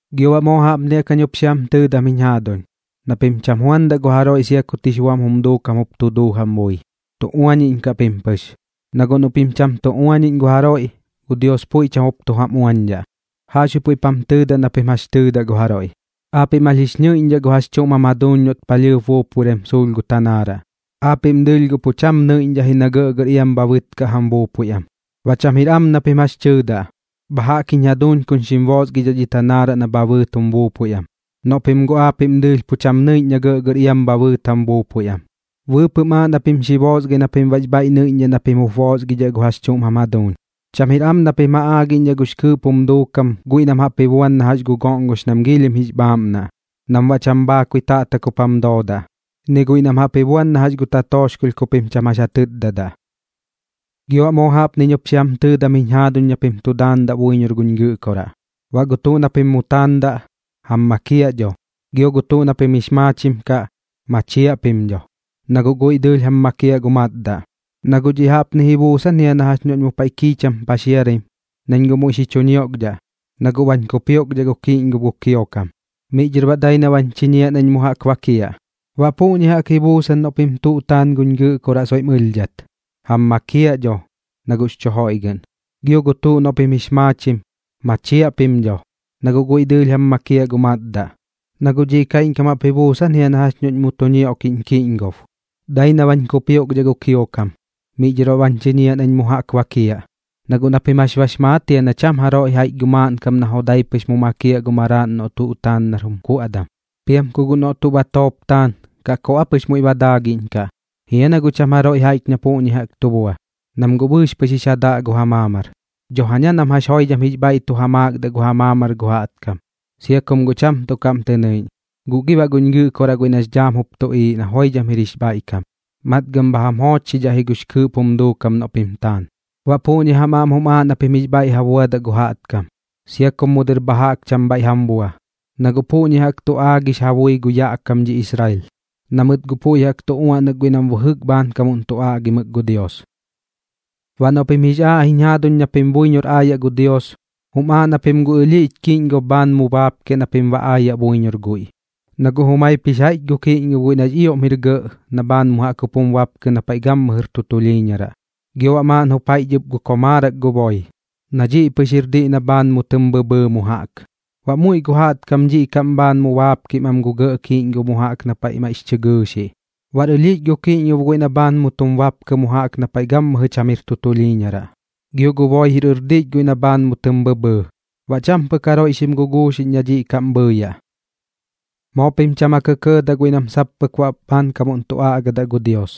’Gio baꞌ moo jaꞌpni jaꞌk jañ jup xi jam tɨɨdam jiñ jaaduñ, na pim cham juandaꞌ gu jaroiꞌ sia kut jix buam jum duukam jup tu duu jam bui. Tu uañiꞌñkaꞌ pim pɨx. Na guꞌ noꞌ pim cham tu uañiꞌñ gu jaroiꞌ, gu Dios puiꞌ cham jup tu jam uañdhaꞌ. Jaꞌxbuiꞌ puiꞌp jam tɨɨdaꞌ na pim jax tɨɨdaꞌ gu jaroiꞌ. Aapiꞌm jax jix ñɨiꞌñdhaꞌ gu jax chuꞌm jam jaduuñ noꞌt palhɨɨp buupuiram suulh gu tanaaraꞌ, aapiꞌm dɨɨlh guꞌ pu cham nɨiꞌñdhaꞌ ji na gɇꞌgɇr iam bha bɨtkaꞌ jam buupui am. Baꞌ cham jir am na pim jax tɨɨdaꞌ: “Bha jaꞌk jiñ jaduuñ kuñ xim boosgidhaꞌ dhi tanaaraꞌ na bha bɨɨt jum buupui am”, noꞌ pim guꞌ aapiꞌm dɨɨlh pu cham nɨiꞌñ na gɇꞌgɇr iam bha bɨɨt jam buupui am. Bɨɨpɨꞌm aaꞌ na pim xi boosgai na pim baꞌx bhaiꞌ nɨiꞌñdhaꞌ na pim jup boosgidhaꞌ gu jax chuꞌm jam jaduuñ. ’Cham jir am na pim ja aagiꞌñdhaꞌ gux kɨɨꞌp jum duukam guiꞌ nam jaꞌp ji buan na jax gu goꞌngox nam giilhim jix bhaaꞌmnaꞌ, nam baꞌ cham bhaakui taꞌtak jup jam doodaꞌ, ni guiꞌ nam jaꞌp ji buan na jax gu tatooxkolh ku pim cham jax ja tɨtdadaꞌ. ’Gio baꞌ moo jaꞌpniñ jup xi jam tɨɨdam jiñ jaaduñ na pim tu daandaꞌ buiñor guñ Gɨꞌkoraꞌ. Baꞌ gu tuꞌ na pim mu taandaꞌ, jam makiaꞌ dho, gio gu tuꞌ na pim jix maachim kaꞌ, machiaꞌ pim dho, na guꞌ guiꞌ dɨɨlh jam makiaꞌ gu matdaꞌ. Na guꞌ dhiꞌ jaꞌpni ji buusan jia na jax noꞌñ mu paiꞌ kiicham paxiaraim nañ muiꞌ xi chu ñioꞌkdhaꞌ, na guꞌ bañ kupioꞌkdhaꞌ gu kiꞌñgob gu kiokam, miꞌ dhɨr baꞌ dai na bañ chiñiaꞌ nañ mu jaꞌk ba bakiaꞌ. Baꞌ puꞌñi jaꞌk ji buusan noꞌ pim tuꞌ taan guñ Gɨꞌkoraꞌ soiꞌm ɨlhdhat, jam makiaꞌ dho, na guꞌx chu joiꞌgɨꞌn. Gio gu tuꞌ noꞌ pim jix maachim, machiaꞌ pim dho, na guꞌ guiꞌ dɨɨlh jam makiaꞌ gu matdaꞌ. Na guꞌ dhiꞌ kaiꞌñkam jaꞌp ji buusan jia na jax noꞌñ mu tu ñioꞌkiꞌñ kiꞌñgob, dai na bañ kupioꞌkdhaꞌ gu kiokam, miꞌ dhɨr baꞌ bañ chiñiaꞌ nañ mu jaꞌk ba bakiaꞌ. ’Na guꞌ na pim jax bax maat jia na cham jaroiꞌ jaiꞌch gu maaꞌnkam na jodai pɨx mu makiaꞌ gu maraaꞌn noꞌ tuꞌ taan nar jum kuaꞌdam. Piam ku guꞌ noꞌ tuꞌ batoop taan, ¿kaꞌ koꞌ aa pɨx muiꞌ ba daagiꞌñkaꞌ? ¿Jia na guꞌ cham jaroiꞌ jaiꞌch na puꞌñi jaꞌk tu bua? Nam guꞌ bɨɨx pɨx jix ja daꞌ gu ja maamar. Dho jaña nam jax joidham jix bhaiꞌ tu ja maakdaꞌ gu ja maamar gu jaꞌtkam, sia kum guꞌ cham tuꞌ kaꞌm tɨ nɨiꞌñ. Guꞌ gi baꞌ guñ Gɨꞌkoraꞌ guiꞌ nax dhaam jup tuꞌiiꞌ na joidham jir jix bhaiꞌkam, matgɨm bha jam joochxidhaꞌ ji gux kɨɨꞌp jum duukam noꞌ pim taan. ’Baꞌ puꞌñi jam aꞌm jum aaꞌ na pim jix bhaiꞌ ja buadaꞌ gu jaꞌtkam, sia kum mu dɨr bha jaꞌk cham bhaiꞌ jam bua, na guꞌ puꞌñi jaꞌk tu aagix ja bui gu yaꞌ kam dhi Israel, na mɨt guꞌ puiꞌ jaꞌk tu uaꞌnak guiꞌ nam bɨjɨk bhaankam tu aꞌgimɨk gu Dios. ’Baꞌ noꞌ pim jix aaꞌ jiñ jaaduñ na pim buiñor aayaꞌ gu Dios, jum aaꞌ na pim gu ɨlhiꞌch kiꞌñgob kaꞌm bhaan mu baapkiaꞌ na pim baꞌ aayaꞌ buiñor guiꞌ. Na guꞌ jumaip jix jaiꞌch jia gu kiꞌñgob guiꞌ nax ioꞌm jir gɇꞌ na bhaan mu jaꞌk jup tum bapkɨ na paiꞌ gammɨjɨr tu tulhiiñaraꞌ, gio baꞌ maaꞌn jup jix jaiꞌch ɨp gu komaarak gu boi, na dhiꞌ pɨx jir diꞌ na bhaan mu tɨm bhɨbhɨɨ mu jaꞌk. Baꞌ muiꞌ gu jaꞌtkam dhiꞌ kaꞌm bhaan mu baapkim am gu gɇꞌ kiꞌñgob mu jaꞌk na paiꞌ maiꞌx chɨ gɨɨxiꞌ. Baꞌr ɨlhiꞌch gu kiꞌñgob guiꞌ na bhaan mu tum bapkɨ mu jaꞌk na paiꞌ gammɨjɨ cham jir tu tulhiiñaraꞌ, gio gu boi jir ɨrdiꞌch guiꞌ na bhaan mu tɨm bhɨbhɨɨ. Baꞌ cham pɨk jaroiꞌ xim guguuxiꞌñ na dhiꞌ kaꞌm bhɨɨyaꞌ. ’Moo pim cham ja kɇkɇɇdaꞌ guiꞌ nam sap pɨk baꞌ bhaankamuꞌn tu aꞌgadaꞌ gu Dios,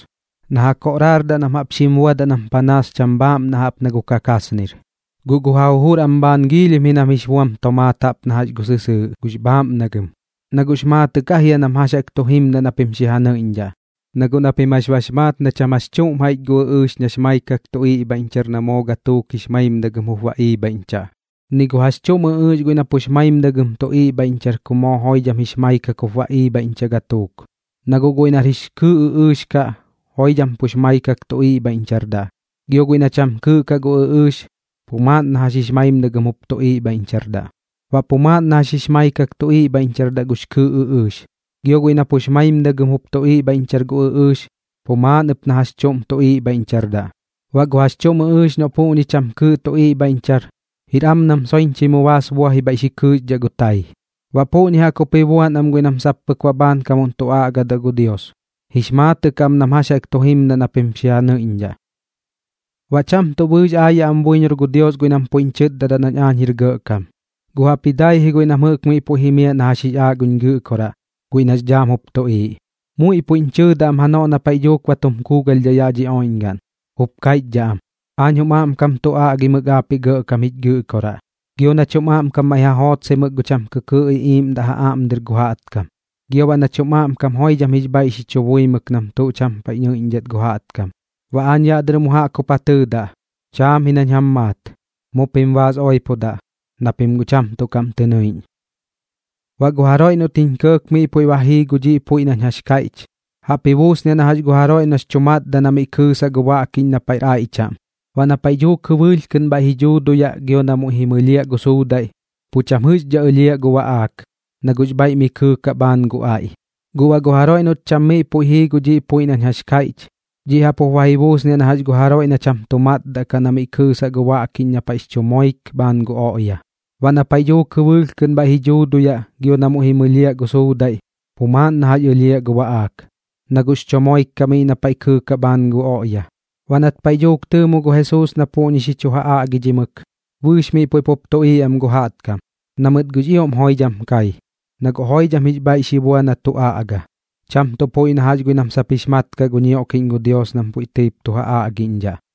na ja koꞌraardaꞌ nam jaꞌp xim buadaꞌ nam panaas cham bhaaꞌmnaꞌ jaꞌp na gu kakasnir, guꞌ gu ja jujur am bhaan giilhim ji nam jix buam tomaat jaꞌp na jax gu sɨsɨɨꞌ gux bhaaꞌmnagɨm. Na guꞌx maatɨꞌ kaꞌ jia nam jax jaꞌk tu jimdaꞌ na pim xi ja nɨiꞌñdhaꞌ. Na guꞌ na pim jax bax maat na cham jax chuꞌm jaiꞌch gu ɨꞌɨɨx nax maikak tu iꞌbhaiꞌñchar na moo gatuuk jix maimdagɨm jup ba iibhaiꞌñchaꞌ, ni gu jax chuꞌm ɨꞌɨɨx guiꞌ na pux maimdagɨm tu iꞌbhaiꞌñchar ku moo joidham jix maikak jup ba iibhaiꞌñchaꞌ gatuuk. Na guꞌ guiꞌ nar jix kɨɨꞌ ɨꞌɨɨx kaꞌ, joidham pux maikak tu iꞌbhaiꞌñchardaꞌ, gio guiꞌ na cham kɨɨꞌ kaꞌ gu ɨꞌɨɨx, pu maaꞌn na jax jix maimdagɨm jup tu iꞌbhaiꞌñchardaꞌ. Baꞌ pu maaꞌn na jax jix maikak tu iꞌbhaiꞌñchardaꞌ gux kɨɨꞌ ɨꞌɨɨx, gio guiꞌ na pux maimdagɨm jup tu iꞌbhaiꞌñchar gu ɨꞌɨɨx, pu maaꞌn ɨp na jax chuꞌm tu iꞌbhaiꞌñchardaꞌ. Baꞌ gu jax chuꞌm ɨꞌɨɨx noꞌ puꞌñi cham kɨɨꞌ tu iꞌbhaiꞌñchar, jir am nam soiñchɨi mu baas buaji bhaiꞌ xi kɨɨxdhaꞌ gu tai. Baꞌ puꞌñi jaꞌk jup ji buan am guiꞌ nam sap pɨk baꞌ bhaankamuꞌn tu aꞌgadaꞌ gu Dios, jix maatɨꞌ kaꞌ nam jax jaꞌk tu jimdaꞌ na pim xi ja nɨiꞌñdhaꞌ. ’Baꞌ cham tuꞌ bɨɨx aayaꞌ am buiñor gu Dios guiꞌ nam puiꞌñ chɨtdadaꞌ nañ aañ jir gɇꞌkam, guꞌ jaꞌpji dai ji guiꞌ nam jɨꞌk miꞌ puiꞌ jimiaꞌ na jax jix aaꞌ guñ Gɨꞌkoraꞌ guiꞌ nax dhaam jup tuꞌiiꞌ. Muiꞌ puiꞌñ chɨɨdaꞌ am janoꞌ na paiꞌ dhuuk ba tum kuugalhdhaꞌ yaꞌ dhi oiꞌñgaꞌn, jup kaiꞌchdhaꞌ am: “Aach jum aꞌmkam tu aꞌgimɨk aapiꞌ Gɇꞌkam jich Gɨꞌkoraꞌ, gio nach jum aꞌmkam maiꞌ ja jootsaimɨk gu cham kɨkɨɨꞌ iꞌiiꞌmdaꞌ ja aꞌm dɨr gu jaꞌtkam, gio baꞌ nach jum aꞌmkam joidham jix bhaiꞌ xi chu buimɨk nam tuꞌ cham paiꞌ nɨidhat gu jaꞌtkam.” Baꞌ aañ yaꞌ dɨr mu jaꞌk jup ja tɨɨdaꞌ: “Chaam ji nañ jam maat. Mu pim baas oipodaꞌ, na pim guꞌ cham tuꞌ kaꞌm tɨ nɨiꞌñ.” ’Baꞌ gu jaroiꞌ noꞌt jiñ kɇɇk miꞌ puiꞌ ba jii gu dhiꞌ puiꞌ nañ jax kaiꞌch, jaꞌp ji buusniaꞌ na jax gu jaroiꞌ noꞌx chu matdaꞌ na miꞌ kɨɨsaꞌ gu baꞌkiꞌñ na paiꞌr aiꞌ chaꞌm. Baꞌ na paiꞌ dhuuk jɨbɨɨlh kɨꞌn bhaiꞌ ji dhuuduyaꞌ gio na muiꞌ ji mɨlhiaꞌ gu suudaiꞌ, pu cham jɨꞌxkat ɨlhiaꞌ gu baꞌaak, na guꞌx bhaiꞌ miꞌ kɨɨkaꞌ bhaan gu aiꞌ. Guꞌ baꞌ gu jaroiꞌ noꞌt cham miꞌ puiꞌ jii gu dhiꞌ puiꞌ nañ jax kaiꞌch, dhiꞌ jaꞌp jup ji buusniaꞌ na jax gu jaroiꞌ na cham tu matdaꞌ kaꞌ na miꞌ kɨɨsaꞌ gu baꞌkiꞌñ na paiꞌx chu moik bhaan gu oꞌya. Baꞌ na paiꞌ dhuuk jɨbɨɨlh kɨꞌn bhaiꞌ ji dhuuduyaꞌ gio na muiꞌ ji mɨlhiaꞌ gu suudaiꞌ, pu maaꞌn na jax ɨlhiaꞌ gu baꞌaak, na guꞌx chu moik kaꞌ miꞌ na paiꞌ kɨɨkaꞌ bhaan gu oꞌya. Baꞌ nat paiꞌ dhuuk tɨɨmo gu Jesuus na puꞌñi xi chu ja aꞌgidhimɨk, bɨɨx miꞌ puiꞌ pup tuꞌiiꞌ am gu jaꞌtkam, na mɨt guꞌx ioꞌm joidham kai. Na guꞌ joidham jix bhaiꞌ xi bua na tu aꞌga, cham tuꞌ puiꞌ na jax guiꞌ nam sap pɨk baꞌx maat kaꞌ gu ñioꞌkiꞌñ gu Dios nam puiꞌ tɨip tu ja aꞌgiꞌñdhaꞌ.